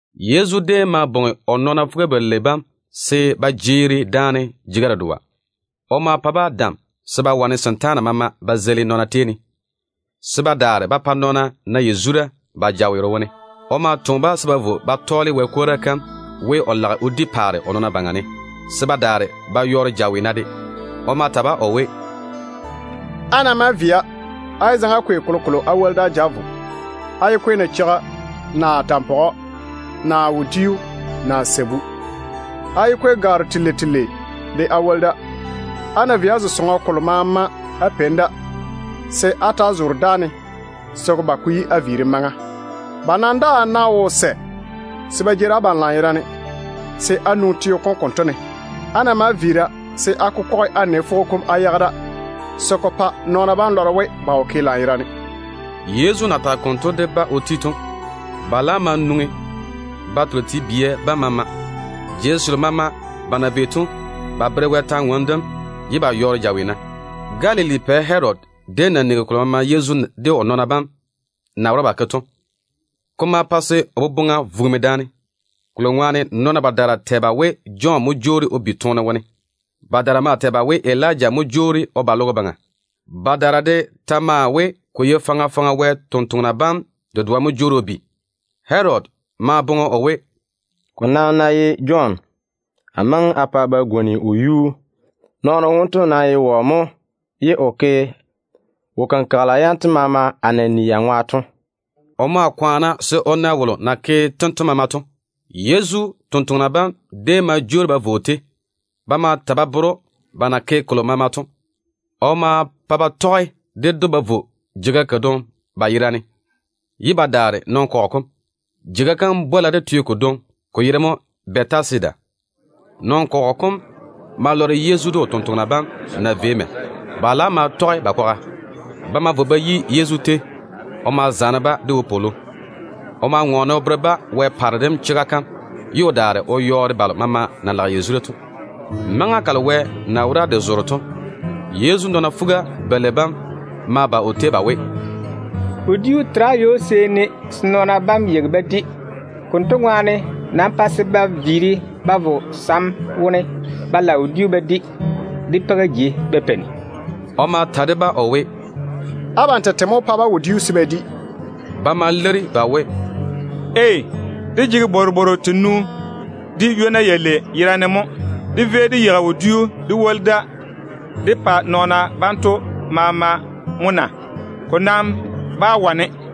Yezu déem ma bwoŋi o nɔɔna fuga-balei bam se ba jeeri daane jeiga dedoa. O ma pa-ba dam se ba wane setaana maama ba zeili nɔɔna tei ne, se ba daare ba pa nɔɔna na yazura ba jaweero wone. O ma toŋe-ba se ba vo ba tɔɔle Wɛ kwora kam we, o lage o di paare o nɔɔna baŋa ne, se ba daare ba yɔɔre jaweena de. O ma ta-ba o we, “Á ná maa via, á yé zaŋe á kwei kolokolo á woli da á ja á vo. Á yé kwei nacheiga, naa tampɔgɔ, naa wodiu, naa sabu. Á yé kwei gwaaro telei telei de á woli da. Á ná vei á zo sɔŋɔ kolo maama á peini da, se á ta‑á zoore dáane se ko ba ko yi á viirim maŋa. Ba nam daa ná wo sɛ se ba jeeri abam lanyerane, se á nwoŋi teo kom konto ne. Á ná maa viira, se á kokɔge á nɛ fwogo kom á yage da, se ko pa nɔɔna bam lɔre we ba wo ke lanyerane.” Yezu na tage konto de ba o ti to, ba laam ma nwoŋi ba tole te-balwa bam maama. Jei selo maama ba na vei to, ba tɔɔle Wɛ kwor-ywoŋa kam ye ba yɔɔre jaweena. Galili kateiri dem pɛ Herodi déem nigi kolo maama Yezu de o nɔɔna bam na wora ba ke to. Ko ma pa se o boboŋa vugimi, kolo ŋwaane nɔɔna badaara tɛ ba we Jɔn mo jwoori o bi toone wone. Badaara maa tɛ ba we Elija mo jwoori o ba logo baŋa. Badaara de ta maa we, ko ye faŋa faŋa Wɛ sampwori sem dedoa mo jwoori o bi. Herodi maa boŋe o we, “Ko nam ná ye Jɔn, amo maŋe a pa ba gwoni o yuu. Nɔɔno wonto nam ye wɔ mo ye o ke wo-kenkagela yanto maama a na ni ya ŋwa to?” O maa kwaana se o na wolo na ke tento maama to. Yezu totoŋa nakwa bam déem ma jwoori ba vo o tei. Ba ma ta ba bere‑o ba na ke kolo maama to. O ma pa ba tɔge ded‑o ba vo jeiga kadwoŋi ba yerane, ye ba daare nɔn-kɔgɔ kom. Jeiga kam bwola de teo kodwoŋi, ko yere mo Bɛtasida. Nɔn-kɔgɔ kom ma lɔre Yezu de o tontoŋena bam na vei mɛ. Ba laam ma tɔge ba kwaga. Ba ma vo ba yi Yezu tei. O ma zaane-ba de wopwolo. O ma ŋɔɔne o bere-ba Wɛ paare dem chega kam, ye o daare o yɔɔre balo maama na lage yazura to. Maŋa kalo wɛ na wora de zoore to, Yezu nɔɔna fuga-balei bam ma ba o tei ba we, “Wodiu tera ywo-seeni se nɔɔna bam yeigi ba di. Konto ŋwaane nam pa se ba vo sam wone ba lage wodiu ba di, de peiga jei ba peini.” O ma ta de-ba o we, “Abam tete mo wó pa-ba wodiu se ba di.” Ba ma leiri ba we, “Dé nam jege bworobwooru tenu de ywona yalei yerane mo. Dé vei dé yeigi wodiu dé woli da dé pa nɔɔna banto maama mo na? Ko nam bá wane.”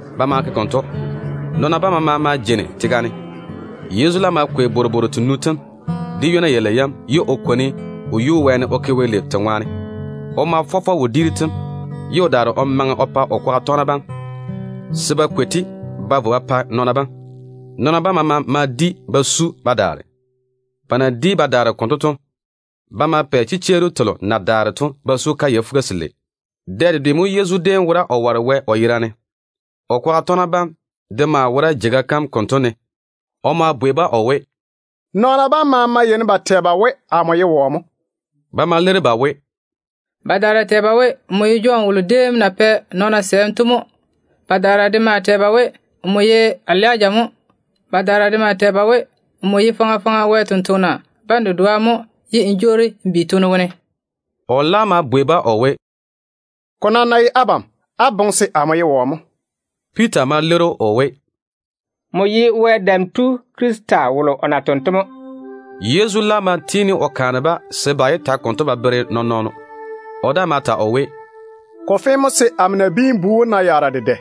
Ba ma ke konto. Nɔɔna bam maama ma jeini tega ne. Yezu laam ma kwei bworobwooru tenu tem de ywona yalei yam, ye o kwoni o yuu wɛɛne o ke Wɛ lei te ŋwaane. O ma fɔ fɔ wodiiru tem, ye o daare o maŋe o pa o kwaga tɔgena bam, se ba kwei-te ba vo ba pa nɔɔna bam. Nɔɔna bam maama ma di ba su ba daare. Ba na di ba daare konto to, ba ma pɛ chichwooru telo na daare to ba su kayɛ fuga-selei. Dɛ dedwe mo Yezu déem wora o ware Wɛ o yerane. O kwaga tɔgena bam de maa wora jeiga kam konto ne. O ma bwei-ba o we, “Nɔɔna bam maama yeini ba tɛ ba we amo ye wɔ mo?” Ba ma leiri ba we, “Badaara tɛ ba we, nmo ye Jɔn wolo déem na pɛ nɔɔna sɛɛm to mo. Badaara de maa tɛ ba we, nmo ye Elija mo. Badaara de maa tɛ ba we, nmo ye faŋa faŋa Wɛ sampwori sem dedoa mo ye n jwoori n bi toone wone.” O laam ma bwei-ba o we, “Ko nam ná ye abam, á boŋe se amo ye wɔ mo?” Piita ma leiri‑o o we, “Nmo ye Wɛ Dam Tu Krista wom mo.” Yezu laam ma tiini o kaane-ba se ba yé ta konto ba bere nɔɔn-nɔɔno. O daa ma ta o we, “Ko fe mo se amo Nabiin-bu wom na yaara dedɛ.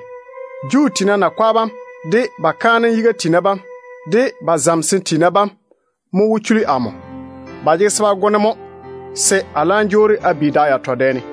Juu tiina nakwa bam, de ba kaanem yiga tiina bam, de ba zamesem tiina bam mo wó chuli amo. Ba jege se ba go-ne mo, se a laam jwoori a bi da yatɔ dɛ ne.”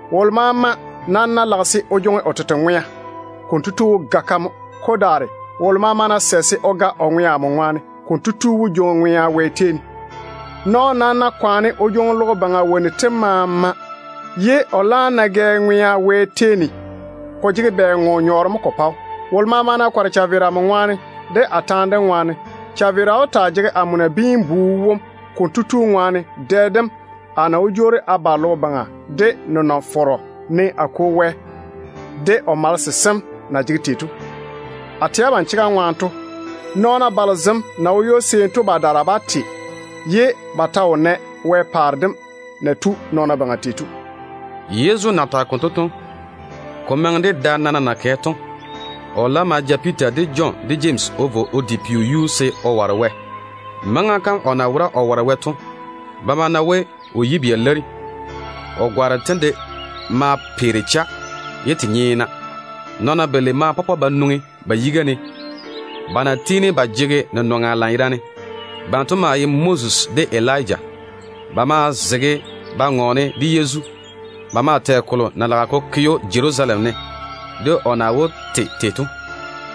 Wolo maama nam ná lage se o jwoŋi o tete ŋwea, konto tu wó ga-ka mo. Ko daare, wolo maama ná sɛ se o ga o ŋwea amo ŋwaane, konto tu wó jwoŋi ŋwea Wɛ tei ne. Nɔɔno nam ná kwaane o jwoŋi logo baŋa jejegero tem maama, ye o laam ná gɛ ŋwea Wɛ tei ne, ko jege bɛ nyɔɔre mo ko pa‑o? Wolo maama ná kɔre chaveera amo ŋwaane, de a taane dem ŋwaane, chaveera wó taa jege amo Nabiin-bu wom konto tu de ŋwaane dɛ dem a na wó jwoori a ba logo baŋa de nenɔŋ-fɔrɔ, ne a Kwo Wɛ de o malese sem na jege tei to. A tɛ abam chega ŋwaane to, nɔɔna balo zem na wo ywo-seeni to badaara bá te ye ba ta wo nɛ Wɛ paare dem na tu nɔɔna baŋa tei to.” Yezu na tage konto to, ko maŋe de da nana na kɛ to, o laam ma ja Piita, de Jɔn, de Jemsi o vo o di peo yuu se o ware Wɛ. Maŋa kam o na wora o ware Wɛ to, ba ma na we o yibia leiri. O gwaaro tem de maa peere cha, ye te nyeena. Nɔɔna balei ma pɔpɔ ba nwoŋi ba yiga ne, ba na tiini ba jege nenɔŋa lanyerane. Banto maa ye Moses de Elija. Ba maa zege ba ŋɔɔne de Yezu. Ba maa tɛ kolo na lage ko ke‑o Jerusalem ne, de o na wó te tei to.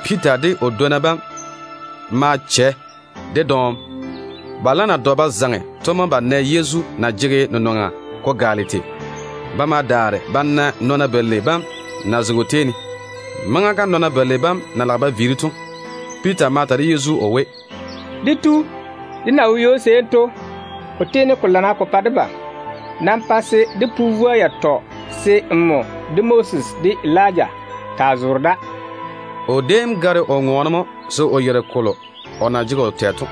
Piita de o dwonna bam ma chɛ de dɔɔm. Ba laam na dɔ ba zaŋe to mo ba nɛ Yezu na jege nenɔŋa ko gaale tei. Ba ma daare ba na nɔɔna balei bam na zege o tei ne. Maŋa kam nɔɔna balei bam na lage ba viiri to, Piita ma ta de Yezu o we, “Dé Tu, dé na wo ywo-seeni to, ko tiini ko lana ko pa debam. Nam pa se dé pu vwoa yatɔ se nmo, de Moses, de Elija taa zoore da.” O déem gare o ŋɔɔne mo se o yeiri kolo o na jege o tɛ to.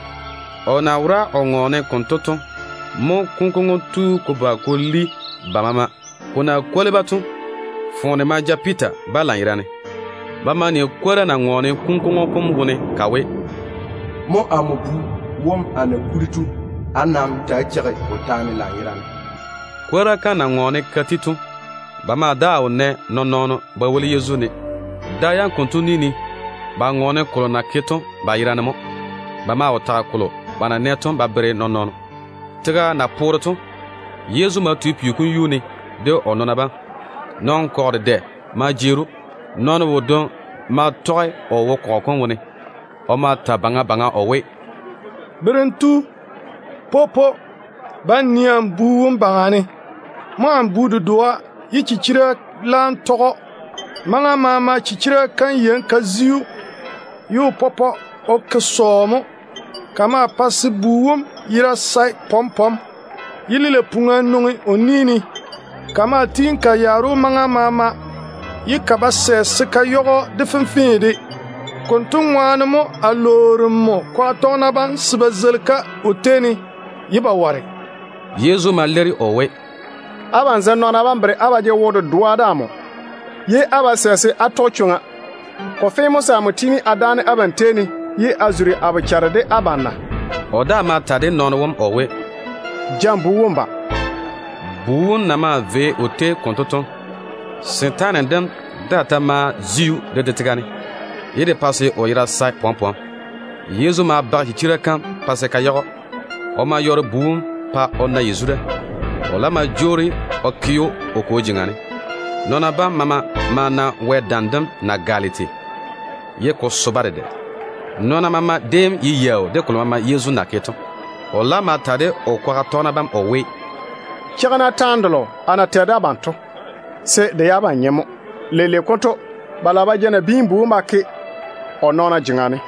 O na wora o ŋɔɔne konto to mo kunkwoŋo tu ko ba ko li ba maama. Ko na kwoli-ba to, foone ma ja Piita ba lanyerane. Ba ma ni kwora na ŋɔɔne kunkwoŋo kom wone ka we, “Mo amo Bu wom a na kuri to. Á nam ta‑á cheigi o taane lanyerane.” Kwora kam na ŋɔɔne ka ti to, ba ma daa wo nɛ nɔɔn-nɔɔno ba woli Yezu ne. Da yam konto ni ne, ba ŋɔɔne kolo na ke to ba yerane mo. Ba maa wo tage kolo ba na nɛ to ba bere nɔɔn-nɔɔno. Tega na poore to, Yezu ma tu peo kom yuu ne de o nɔɔna bam. Nɔn-kɔgɔ dedɛ ma jeeri‑o. Nɔɔno wodwoŋi maa tɔge o wo kɔgɔ kom wone. O ma ta baŋa baŋa o we, “Berem tu, popo, ba n nii amo bu wom baŋa ne. Mo amo bu dedoa ye chichira laam tɔge‑o. Maŋa maama chichira kam yeini ka zi‑o, ye o pɔpɔ o ke sɔɔ mo. Ka maa pae se bu wom yera sae pɔm-pɔm, ye lilei-puŋa nwoŋi o ni ne. Ka maa tiini ka yaare‑o maŋa maama, ye ka ba sɛ se ka yage‑o de fenfee de. Konto ŋwaane mo a lwoori nmo kwaga tɔgena bam se ba zeili-ka o tei ne, ye ba ware.” Yezu ma leiri o we, “Abam zem nɔɔna bam bere á ba jege wo-dedoa de amo, ye á ba sɛ se á tɔge chwoŋa. Ko fe mo se a tiini a dáane abam tei ne, ye a zuri a bochare de abam na?” O daa ma ta de nɔɔno wom o we, “Ja n bu wom n ba.” Bu wom na maa vei o tei konto to, setaane dem daa ta ma zi‑o de de tega ne, ye de pa se o yera sae pɔm-pɔm. Yezu ma bage chichira kam pa se ka yage‑o. O ma yɔɔre bu wom pa o na yazura. O laam ma jwoori o ke‑o o kwo jeŋa ne. Nɔɔna bam maama ma na Wɛ dam dem na gaale tei, ye ko so-ba dedɛ. Nɔɔna maama déem ye yaau de kolo maama Yezu na ke to. O laam ma ta de o kwaga tɔgena bam o we, “Cheigi-na taane delo a na tɛ de abam to, se de ye abam nyem mo. Leile konto ba lage ba ja Nabiin-bu wom ba ke‑o nɔɔna jeŋa ne.”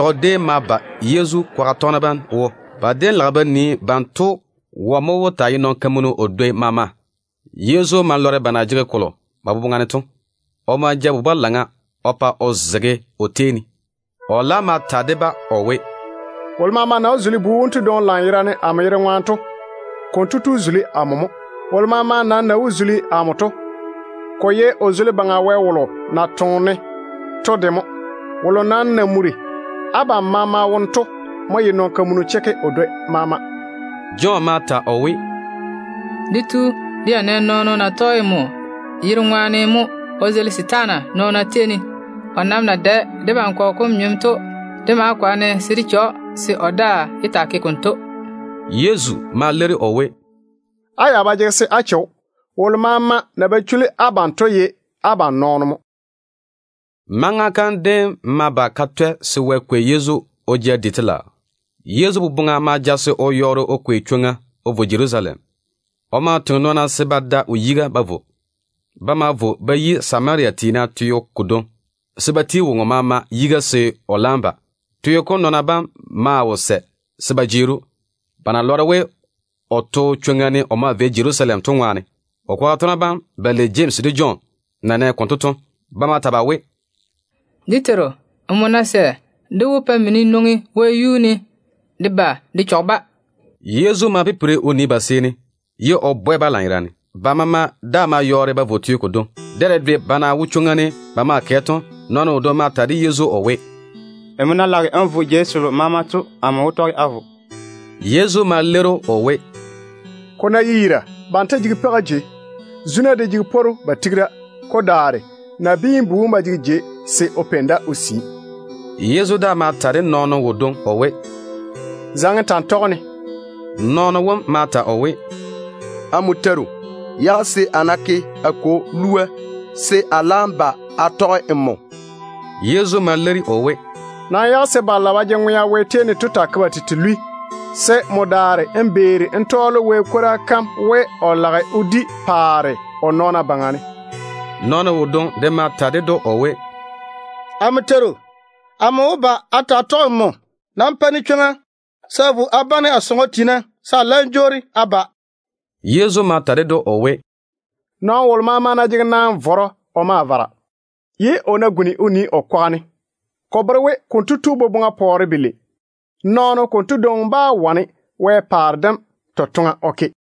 Ni-kantɔgɔ déem ma ba Yezu kwaga tɔgena bam wo. Ba déem lage ba nii banto wɔ mo wó taa ye nɔn-kamunu o dwoi maama. Yezu ma lɔre ba na jege kolo ba boboŋa ne to. O ma ja bu-balaŋa o pa o zege o takeiri ne. O laam ma ta de-ba o we, “Wolo maama ná zuli bu wonto dwoŋi lanyerane amo yere ŋwaane, konto tu zuli amo mo. Wolo maama nam ná zuli amo, kotu zuli Baŋa Wɛ wolo na toŋe-ne to de mo. Wolo nam na muri abam maama wone to mo ye nɔn-kamunu chekke o dwoi maama.” Jɔn ma ta o we, “Dé Tu, dé ya nɛ nɔɔno na tɔge nmo yere ŋwaane mo o zeili setaana nɔɔna tei ne. O nam na dae debam kɔgɔ kom nyem to, dé ma kwaane se de che‑o se o daa yé taa ke konto.” Yezu ma leiri o we, “Á ya ba jege se á che‑o. Wolo maama na ba chuli abam to ye abam nɔɔno mo.” Maŋa kam déem ma ba ka twɛ se Wɛ kwei Yezu o ja di telaao. Yezu boboŋa ma ja se o yɔɔre o kwei chwoŋa o vo Jerusalem. O ma toŋe nɔɔna se ba da o yiga ba vo. Ba ma vo ba yi Samaria tiina teo kodwoŋi, se ba ti woŋo maama yiga se o laam ba. Teo kom nɔɔna bam maa wo sɛ se ba jeeri‑o, ba na lɔre we o to chwoŋa ne o maa vei Jerusalem to ŋwaane. O kwaga tɔgena bam balei Jemsi de Jɔn na nɛ konto to, ba ma ta ba we, “Dé Teiru, nmo ná sɛ, dé wó pa mini nwoŋi wɛyuu ne de ba de chɔge-ba.” Yezu ma pipiri o nii ba seeni, ye o bwɛ-ba lanyerane. Ba maama daa ma yɔɔre ba vo teo kodwoŋi. Dɛ dedwe ba na wo chwoŋa ne ba maa kɛ to, nɔɔno wodwoŋi ma ta de Yezu o we, “Nmo na lage n vo jei selo maama to, amo de wó tɔge a vo.” Yezu ma leiri‑o o we, “Ko ná ye yira, banto jege peiga jei. Zuna de jege pworu ba tigi da. Ko daare Nabiin-bu wom ba jege jei se o peini da o sii.” Yezu daa ma ta de nɔɔno wodwoŋi o we, “Zaŋe n ta n tɔge-ne.” Nɔɔno wom ma ta o we, “Amo Teiru, yage se a ná ke a kwo lua, se a laam ba a tɔge nmo kwaga.” Yezu ma leiri o we, “Nam yage se balo na ba jege ŋwea Wɛ tei ne to taa ke ba tete lwi, se nmo daare n beeri n tɔɔle Wɛ kwora kam we, o lage o di paare o nɔɔna baŋa ne.” Nɔɔno wodwoŋi de ma ta ded‑o o we, “Amo Teiru, amo wó ba a taa tɔge nmo kwaga. Nam pa-ne chwoŋa se a vo a bane a sɔŋɔ tiina, se a laam jwoori a ba.” Yezu ma ta ded‑o o we, “Nɔɔno wolo ná jege naan-vɔrɔ o ma vara, ye o ná guni o nii o kwaga ne, ko bere we konto tu boboŋa pɔɔre belei. Nɔɔno konto dwoŋi bá wane Wɛ paare dem totoŋa o ke.”